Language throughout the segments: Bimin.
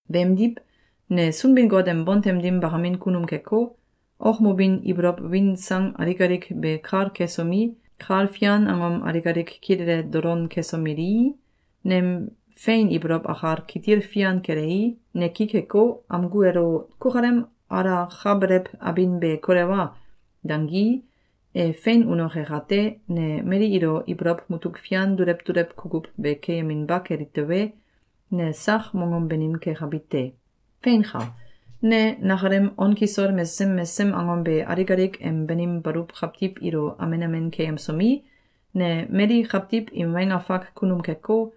Beemdiw, ne Sunbin-Got em bontem dim bakamin kunum keko, okmobin ibolow win sang alik alik be kal kesomi, kal fian angom alik alik kilele dolon kesomelii, nem fein ibolow akal kitil fian kelei, ne ki keko, amgu elo “Kukalem alakabelew abin be kolewa!”, dangii, e fein unoke kate, ne mali ilo ibolow mutuk fian dulew dulew kukuw be keyeminba keli tewe, ne sak mongom banim kekabi te. Feinka! Ne nakalem on kisol mesesem mesesem angom be alik alik em banim baluw kawtiw ilo amen amen keyemsomi, ne mali kawtiw im weng afak kunum keko,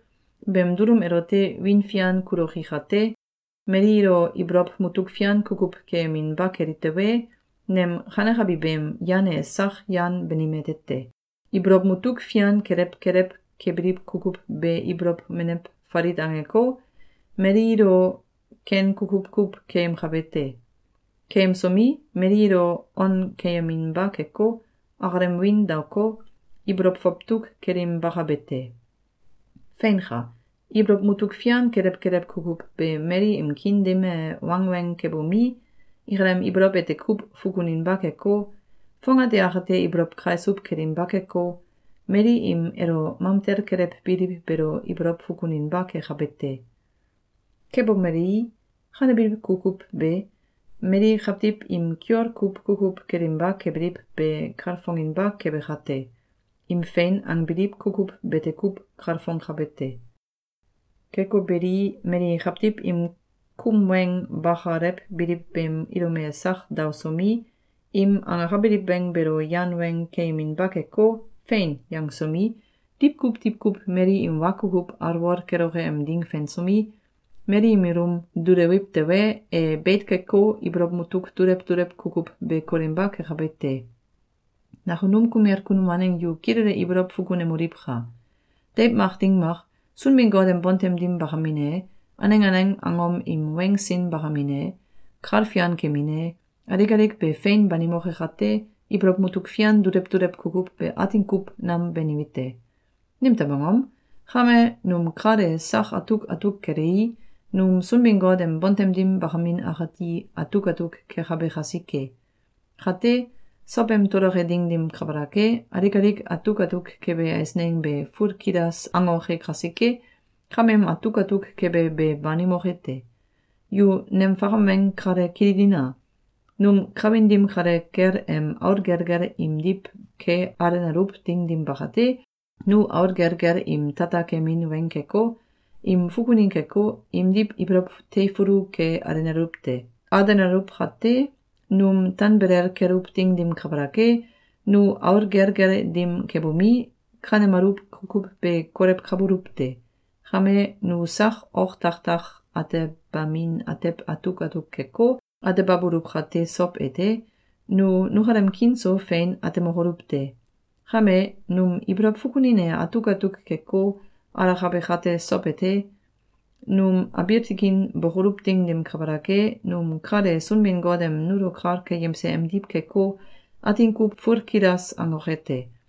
beem dulum elote wiin fian kuloki kate, mali ilo ibolow mutuk fian kukuw keyeminba keli tewe, nem kanekabi beem yan e sak yan banim ete te. Ibolow mutuk fian kelew kelew kebiliw kukuw be ibolow menew falit angeko, mali ilo ken kukuw kuw keyemkabe te. Keyemsomi, mali ilo on keyeminba keko, akalem wiin daoko, ibolow fawtuk kelinbakabe te. Feinka! Ibolow mutuk fian kelew kelew kukuw be mali im kiin dim e wangweng kebomi, akalem ibolow ete kuw fukuninba keko, fongate akate ibolow kaisuw kelinba keko, mali im elo mamtel kelewbiliw beelo ibolow fukuninba kekabe te. Kebomelei, kanebiliw kukuw be mali kawtiw im kiol kuw kukuw kelinba kebiliw be kalfonginba kebe kate, im fein angbiliw kukuw bete kuw kalfongkabe te. Keko beli, mali kawtiw im kum weng bakalewbiliw beem ilum e sak daosomi, im angakabiliw weng beelo yan weng keyeminba keko, “Fein!”, yangsomi, diwkuw diwkuw mali im wa kukuw alwol keloke em ding fensomi, mali im ilum dulewiw tewe, e beit keko, ibolow mutuk dulew dulew kukuw be kolinba kekabe te. Nakunum kumel kunum waneng yu kilele ibolow fukunemoliwka! Deiw mak ding mak, Sunbin-Got em bontem dim bakamin e, aneng aneng angom im weng sin bakamin e, kal fian kemin e, alik alik be fein banimoke kate, ibolow mutuk fian dulew dulew kukuw be atin kuw nam banime te. Nimtew angom? Kame, num kal e sak atuk atuk kelei, num Sunbin-Got em bontem dim bakamin akati atuk atuk kekabe kasike. Kate, sowem toloke ding dim kabalak e, alik alik atuk atuk kebe eisneng be fulkilas angoke kasike, kameem atuk atuk kebe be banimoke te. Yu nem fakam weng kale kililina! Num kawin dim kale kel em aul gelgel imdiw ke alenaluw ding dim bakate, nu aul gelgel im tata kemin weng keko, im fukunin keko, imdiw ibolow teifulu ke alenaluw te. Alenaluw kate, num tanbelel keluw ding dim kabalak e, nu aul gelgel dim kebomi, kanemaluw kukuw be kolewkabuluw te. Kame, nu sak oktakak atebamin atew atuk atuk keko, atebabuluw kate sow ete, nu nukalem kiin so fein atemokoluw te. Kame, num ibolow fukunin e atuk atuk keko, alakabe kate sow ete, num abiil tikin bokoluw ding dim kabalak e, num kal e Sunbin-Got em nulo kal keyemse emdiw keko, atin kuw fulkilas angoke te.